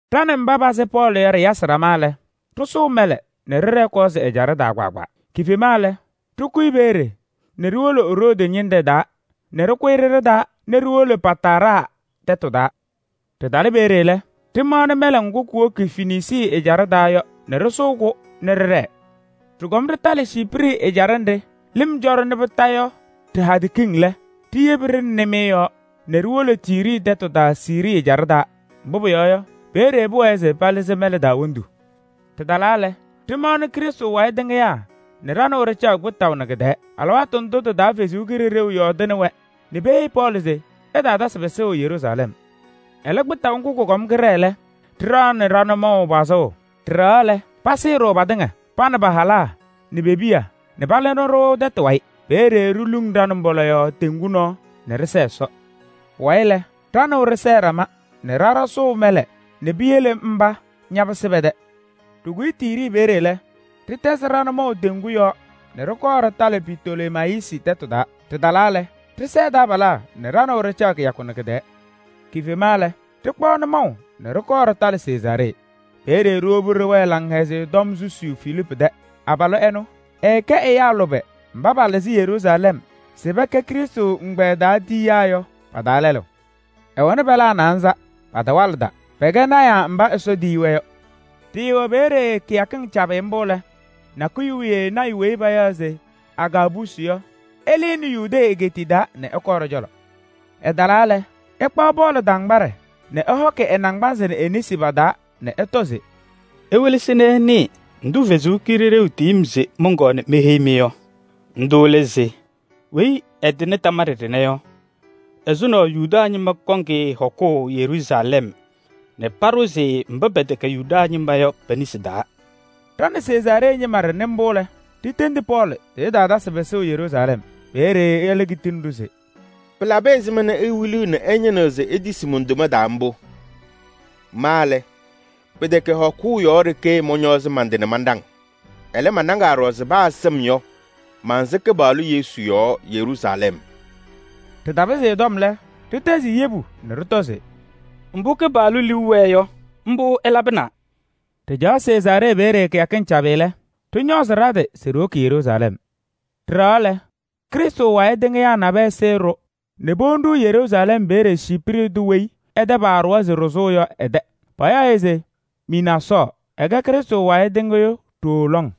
Ɖa nɛ mba pasɩ Pɔɔlɩ yɔ ɖɩyasɩ ɖama lɛ, ɖɩsʋʋ mɛlɛ nɛ ɖɩɖɛɛ Kɔɔsɩ ɛjaɖɛ taa kpaagbaa. Kifema lɛ, ɖɩkʋyɩ peeye nɛ ɖiwolo Roodi ñɩnɖɛ taa nɛ ɖɩkʋyɩ ɖɩɖɩ taa nɛ ɖiwolo Pataraa tɛtʋ taa. Ɖɩtalɩ peeye lɛ, ɖɩmaɣnɩ mɛlɛ ŋgʋ kuwoki Fenisii ɛjaɖɛ taa yɔ nɛ ɖɩsʋʋ-kʋ nɛ ɖɩɖɛɛ. Ɖɩkɔm ɖɩtalɩ Ciiprɩ ɛjaɖɛ nɖɩ lɩm cɔ-ɖɩ Kondiko yɔ ɖɩ-hadɛ kiŋ lɛ, ɖiyebi-ɖɩ nɩmɩyɛ yɔɔ nɛ ɖiwolo Tiiri tɛtʋ taa Siirii ɛjaɖɛ taa. Mbʋ pʋyɔɔ yɔ, peeye pʋwɛɛ se palɩzɩ mɛlɛ taa wondu. Ɖɩtalaa lɛ, ɖɩmaɣnɩ Krɩstʋ wayɩ tɩŋɩyaa nɛ ɖa nɛ wɛ ɖɩcaɣ kpɩtaʋ nɛ kɩ-tɛɛ. Alɩwaatʋ ndʋ tɩ-taa Ɛsɔ Kalɩzaɣ yɔɔdɩnɩ-wɛ nɛ peheyi Pɔɔlɩ se ɛtaatasɩ pɩsʋʋ Yeruusalɛm. Ɛlɛ, kpɩtaʋ ŋgʋ kʋkɔm kɩɖɛɛ lɛ, ɖɩɖaɣnɩ ɖa-nʋmɔʋ pazʋʋ. Ɖɩɖɛɣaɣ lɛ, pasɩɩ-ɖʋ patɩŋa, pa nɛ pa-halaa nɛ pe-piya nɛ palɩnɩ-ɖʋ tɛtʋ wayɩ. Peeye ɖiluŋ ɖa-nʋmbɔla yɔɔ teŋgu nɔɔ nɛ ɖɩsɛɛ Ɛsɔ. Pʋwayɩ lɛ, ɖa nɛ wɛ ɖɩsɛɛ ɖama nɛ ɖa ɖasʋʋ mɛlɛ nɛ piyele mba ñapɩsɩ pɛ-tɛ. Ɖɩkʋyɩ Tiiri peeye lɛ, ɖɩtɛzɩ ɖa-nʋmɔʋ teŋgu yɔɔ nɛ ɖɩkɔɔ ɖɩtalɩ Pitolemayisi tɛtʋ taa. Ɖɩtalaa lɛ, ɖɩsɛɛ taabalaa nɛ ɖa nɛ wɛ ɖɩcaɣ kɩyakʋ nɛ kɩ-tɛɛ. Kifema lɛ, ɖɩkpaɣ nʋmɔʋ nɛ ɖɩkɔɔ ɖɩtalɩ Sezaaree. Peeye ɖiwobi ɖɩwɛɛ Laŋhɛzɩyɛ Tɔm susiyu Filiipu tɛ. Abalʋ ɛnʋ, ɛɛkɛ ɛyaa lʋbɛ mba palɩzɩ Yeruusalɛm se pɛkɛ Krɩstʋ ɛgbɛyɛ taa tayɩyaa yɔ pa-taa lɛlʋ. Ɛɛwɛnɩ pɛlaa naanza, patawalɩda, pɛkɛ lɔɔyɩsɩ tɩnaa. Ɖɩɩwɛ peeye kɩyakɩŋ cabɩ mbʋ lɛ, nakʋyʋ wiye lɔɔyaɣ tʋ weyi payaɣ se Agaabusi yɔ, ɛlɩnɩ Yudee egeetiye taa nɛ ɛkɔɔ ɖɔ-cɔlɔ. Ɛtalaa lɛ, ɛkpaɣ Pɔɔlɩ tambaɖɛ nɛ ɛhɔkɩ ɛ-naŋgbanzɩ nɛ e-nesi pa-taa nɛ ɛtɔ se: “Iwelesi nɛ ɩnɩɩ ndʋ Ɛsɔ Kalɩzaɣ tiyi-m se mɔnkɔɔ meheyi-mɩ yɔ. Ndʋ lɛ se: weyi ɛtɩnɩ tambaɖɛ ɖɩnɛ yɔ, ɛzʋnɔ Yuda ñɩma kɔŋ-ɩ hɔkʋʋ Yeruusalɛm nɛ paɖʋzɩ-ɩ mba pɛtɛkɛ Yuda ñɩma yɔ pe-nesi taa.” Ɖa nɛ Sezaaree ñɩma ɖɩnɩ mbʋ lɛ, ɖitendi Pɔɔlɩ se ɛtaatasɩ pɩsʋʋ Yeruusalɛm. Peeye ɛlɛ kitini-ɖʋ se: “Pɩlabɩ ɛzɩma nɛ iwiliɣ nɛ ɩñɩnɩɣ se itisi mon-toma taa mbʋ? Ma lɛ, pɩtɛkɛ hɔkʋʋ yɔɔ ɖeke mɔñɔɔzɩ man-tɩ nɛ manɖaŋ. Ɛlɛ, manɖaŋaa ɖɔɖɔ se paa sɩm yɔ, mansɩ Kɩpaɣlʋ Yesu yɔɔ Yeruusalɛm.” Ɖɩtapɩzɩ ɛ-tɔm lɛ, ɖɩtɛzɩ-ɩ yebu nɛ ɖɩtɔ se: “Mbʋ Kɩpaɣlʋ liu wɛɛ yɔ, mbʋ ɛlabɩna!” Ɖɩcaɣ Sezaaree peeye kɩyakɩŋ cabɩ lɛ, ɖɩñɔɔzɩ ɖa-tɩ se ɖiwoki Yeruusalɛm. Ɖɩɖɛɣaɣ lɛ, Krɩstʋ wayɩ tɩŋɩyaa nabɛyɛ sɩɩ-ɖʋ nɛ powoni-ɖʋ Yeruusalɛm peeye Ciiprɩ tʋ weyi ɛ-tɛ paaɖʋwa se ɖɩsʋʋ yɔ ɛ-tɛ. Payaɣ-ɩ se Mɩnaasɔɔ, ɛkɛ Krɩstʋ wayɩ tɩŋɩyʋ ɖooo lɔŋ.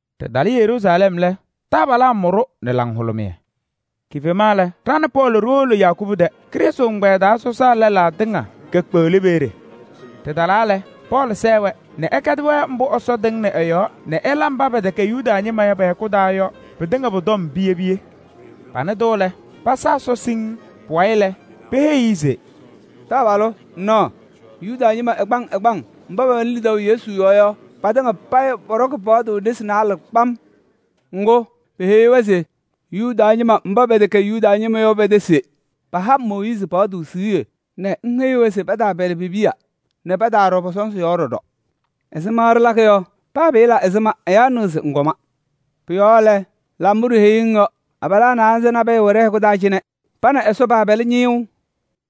Ɖɩtalɩ Yeruusalɛm lɛ, taabalaa mʋ-ɖʋ nɛ laŋhʋlʋmɩyɛ. Kifema lɛ, ɖa nɛ Pɔɔlɩ ɖiwolo Yakubu tɛ. Krɩstʋ ɛgbɛyɛ taa sɔsaa lɛlaa tɩŋa kekpeɣli peeye. Ɖɩtalaa lɛ, Pɔɔlɩ sɛɛ-wɛ nɛ ɛkɛdɩ-wɛ mbʋ Ɛsɔ tɩŋnɩ ɛ-yɔɔ nɛ ɛla mba pɛtɛkɛ Yuda ñɩma yɔ pɛ-hɛkʋ taa yɔ pɩtɩŋa pʋ-tɔm piye piye. Panɩ-tʋ lɛ, pasa Ɛsɔ pɩŋŋ. Pʋwayɩ lɛ, peheyi-i se: “Taabalʋ! Ŋnaɣ, Yuda ñɩma ɛgbaŋ ɛgbaŋ mba pɛwɛnɩ lidaʋ Yesu yɔɔ yɔ, patɩŋa payɩ pɔɖɔkɩ paɣtʋ nesi naalɛ kpam. Ŋgʋ, peheyi-wɛ se ŋwɩlɩɣ Yuda ñɩma mba pɛwɛ mba pɛtɛkɛ Yuda ñɩma yɔ pɛ-tɛ se paha Mooyiizi paɣtʋ siɣye nɛ ŋheyiɣ-wɛ se pataapɛlɩ pe-piya nɛ pataaɖɔ pɔ-sɔnzɩ yɔɔ ɖɔɖɔ. Ɛzɩma ɖɩlakɩ yɔ? Paa pɩɩla ɛzɩma ɛyaa nɩɣ se ŋkɔma. Pʋ-yɔɔ lɛ, la mbʋ ɖiheyiɣ-ŋ yɔ. Abalaa naanza nabɛyɛ wɛ ɖɛ-hɛkʋ taa cɩnɛ, pa nɛ Ɛsɔ paapɛlɩ ñɩyʋʋ.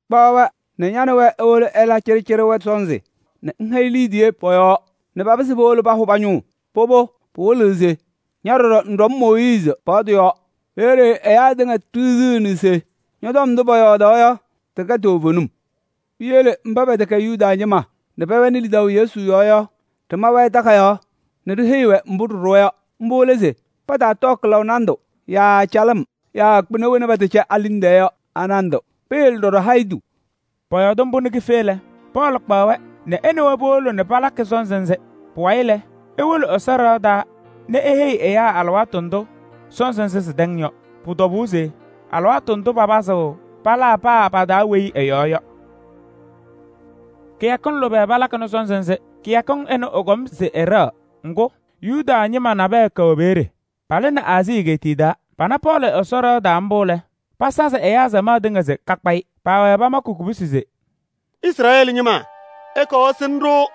Kpaɣ-wɛ nɛ ña nɛ wɛ iwolo ɩla cɩɖɩcɩɖɩ wɛtʋ sɔnzɩ nɛ ŋhɛyɩ liidiye pɔ-yɔɔ nɛ papɩzɩ powolo pahʋ pa-ñʋŋ. Pʋbʋ, pɩwɩlɩɣ se ña ɖɔɖɔ ŋɖɔŋ Mooyiizi paɣtʋ yɔɔ. Peeye ɛyaa tɩŋa ɖiɣziɣni se ñɔ-tɔm ndʋ pɔyɔɔdaɣ yɔ, tɩtɛkɛ toovenim. Piyele mba pɛtɛkɛ Yuda ñɩma nɛ pɛwɛnɩ lidaʋ Yesu yɔɔ yɔ, ɖɩma-wɛ takayaɣ nɛ ɖiheyi-wɛ mbʋ ɖɩɖʋwa yɔ. Mbʋ lɛ se pataatɔɔ kɩlaʋ nandʋ yaa calɩm yaa kpɩna wena pɛtɛcɛ a-liŋ tɛɛ yɔ a-nandʋ. Peyele ɖɔɖɔ hayitu.” Pɔyɔɔdɩ mbʋ nɛ kife lɛ, Pɔɔlɩ kpaɣ-wɛ nɛ ɛ nɛ wɛ powolo nɛ palakɩ sɔnzɩ nzɩ. Pʋwayɩ lɛ, ewolo Ɛsɔ ɖɩɣa taa nɛ eheyi ɛyaa alɩwaatʋ ndʋ sɔnzɩ nzɩ sɩtɛŋ yɔ. Pʋ-tɔbʋʋ se alɩwaatʋ ndʋ papɩzɩɣ palaa paa pa-taa weyi ɛ-yɔɔ yɔ. Kɩyakɩŋ lʋbɛ palakɩnɩ sɔnzɩ nzɩ. Kɩyakɩŋ ɩnʋ ɩkɔm se ɩɖɛɣ, ŋgʋ, Yuda ñɩma nabɛyɛ kɛwɛ peeye. Palɩnɩ Aazii egeetiye taa. Pana Pɔɔlɩ Ɛsɔ ɖɩɣa taa mbʋ lɛ, pasazɩ ɛyaa samaɣ tɩŋa se kakpa-ɩ. Paawɛɛ pamakɩ kubusi se: “Izrɛɛlɩ ñɩma, ɩkɔɔ ɩsɩnɩ-ɖʋ!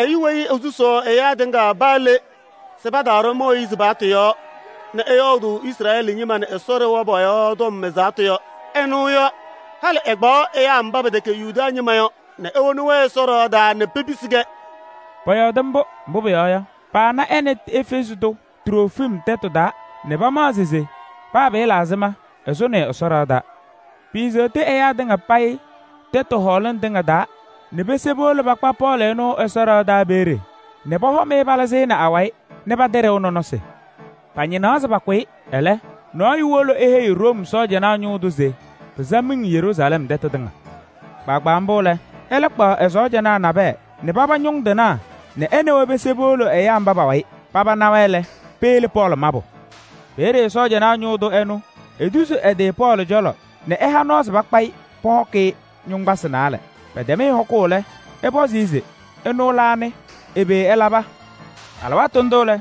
Ɛyʋ weyi esusuu ɛyaa tɩŋa paa le se pataaɖɔ Mooyiizi paɣtʋ yɔɔ nɛ ɛyɔɔdʋʋ Izrɛɛlɩ ñɩma nɛ Ɛsɔ ɖɩɣa pɔ-yɔɔ tɔm ɛzaɣtʋ yɔ, ɛnʋ yɔ. Halɩ ɛkpaɣ mba pɛtɛkɛ Yuda ñɩma yɔ nɛ ewoni Ɛsɔ ɖɩɣa taa nɛ pepisi-kɛ!” Pɔyɔɔdɩ mbʋ, mbʋ pʋyɔɔ yɔ, paana ɛ nɛ Efɛɛzɩ tʋ Trofim tɛtʋ taa nɛ pamaɣzɩ se paa pɩɩla ɛzɩma, ɛsʋnɩ-ɩ Ɛsɔ ɖɩɣa taa. Piiseɣti ɛyaa tɩŋa payɩ tɛtʋ hɔɔlɩŋ tɩŋa taa nɛ pese powolo pakpa Pɔɔlɩ ɛnʋ Ɛsɔ ɖɩɣa taa peeye nɛ pɔhɔm-ɩ palɩzɩnɩ awayɩ nɛ patɩɖɩʋ nɔnɔsɩ. Pañɩnaɣ se pakʋ-ɩ. Ɛlɛ, nɔɔyʋ wolo eheyi Room sɔɔjanaa ñʋʋ tʋ se pɩsa miŋ Yeruusalɛm tɛtʋ tɩŋa. Kpaagbaa mbʋ lɛ, ɛlɛ kpaɣ ɛ-sɔɔjanaa nabɛyɛ nɛ paba ñʋŋ tɩnaa nɛ ɛ nɛ wɛ pese powolo ɛyaa mba pa-wayɩ. Paba na-wɛ lɛ, peyele Pɔɔlɩ mabʋ. Peeye sɔɔjanaa ñʋʋ tʋ ɛnʋ etuzi ɛ-tɩ Pɔɔlɩ cɔlɔ nɛ ɛha nɔɔ se pakpa-ɩ pɔhɔkɩ-ɩ yoŋgbasɩ naalɛ. Pɛtɛm-ɩ hɔkʋʋ lɛ, ɛpɔzɩ se: ɛnʋ lɛ anɩ? Ɛbɛ ɛlaba? Alɩwaatʋ ndʋ lɛ,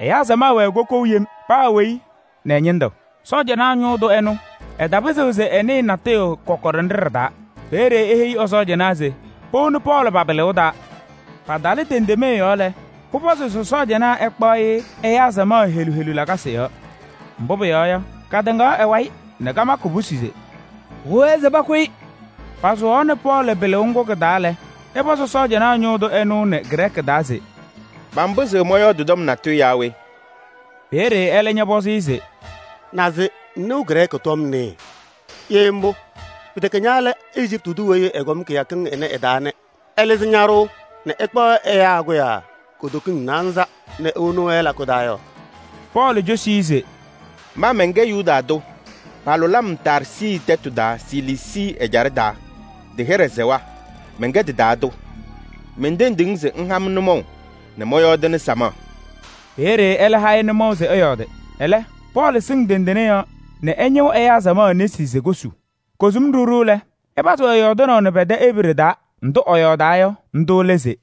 ɛyaa samaɣ wɛɛ kokou yem: paa weyi nɛ ɛ-ñɩndʋ. Sɔɔjanaa ñʋʋ tʋ ɛnʋ, ɛtapɩzɩɣ se ɛnɩɩ kɔkɔɖɛ nɖɩ ɖɩ-taa. Peeye eheyi ɛ-sɔɔjanaa se powoni Pɔɔlɩ pa-pɩlɩʋ taa. Patalɩ tendemee yɔɔ lɛ, pʋpɔzɩ se sɔɔjanaa ɛkpaɣ-ɩ ɛyaa samaɣ helu helu lakasɩ yɔɔ. Mbʋ pʋyɔɔ yɔ, katɩŋaɣ ɛ-wayɩ nɛ kamakɩ kubusi se: “Pʋwɛɛ se pakʋ-ɩ!” Pasʋwaɣnɩ Pɔɔlɩ pɩlʋʋ ŋgʋ kɩ-taa lɛ, ɛpɔzɩ sɔɔjanaa ñʋʋ tʋ ɛnʋ nɛ Grɛɛkɩ taa se: “Manpɩzɩɣ mɔyɔɔdɩ tɔm natʋyʋ yaa we?” Peeye ɛlɛ ñɔpɔzɩ-ɩ se: “Naze ŋnɩɣ Grɛɛkɩ tɔm nɩɩ? Ye mbʋ, pɩtɛkɛ ña lɛ Ejiptɩ tʋ weyi ɛkɔm kɩyakɩŋ ɩnɛ ɩ-taa nɛ ɛlɩzɩ ñaɖʋʋ nɛ ɛkpaɣ ɛyaa kʋyaa kutokiŋ naanza nɛ ewoni lakʋ taa yɔ?” Pɔɔlɩ cosi-i se: “Ma mɛnkɛ Yuda tʋ, palʋlɩ-m Taarsɩ tɛtʋ taa Siliisii ɛjaɖɛ taa, tɩ-hɩɖɛ sɛwa, mɛnkɛ tɩ-taa tʋ. Mentendiɣ-ŋ se ŋha-m nʋmɔʋ nɛ mɔyɔɔdɩnɩ samaɣ.” Peeye ɛlɛ ha-ɩ nʋmɔʋ se ɛyɔɔdɩ. Ɛlɛ Pɔɔlɩ sɩŋ tendene yɔɔ nɛ ɛñɩɣ samaɣ nesi se kosu. Kosum ɖiɣ ɖiɣ lɛ, ɛpazɩ-wɛ yɔɔdɩnaʋ nɛ pɛ-tɛ Ebree taa. Ndʋ ɛyɔɔdaa yɔ, ndʋ lɛ se: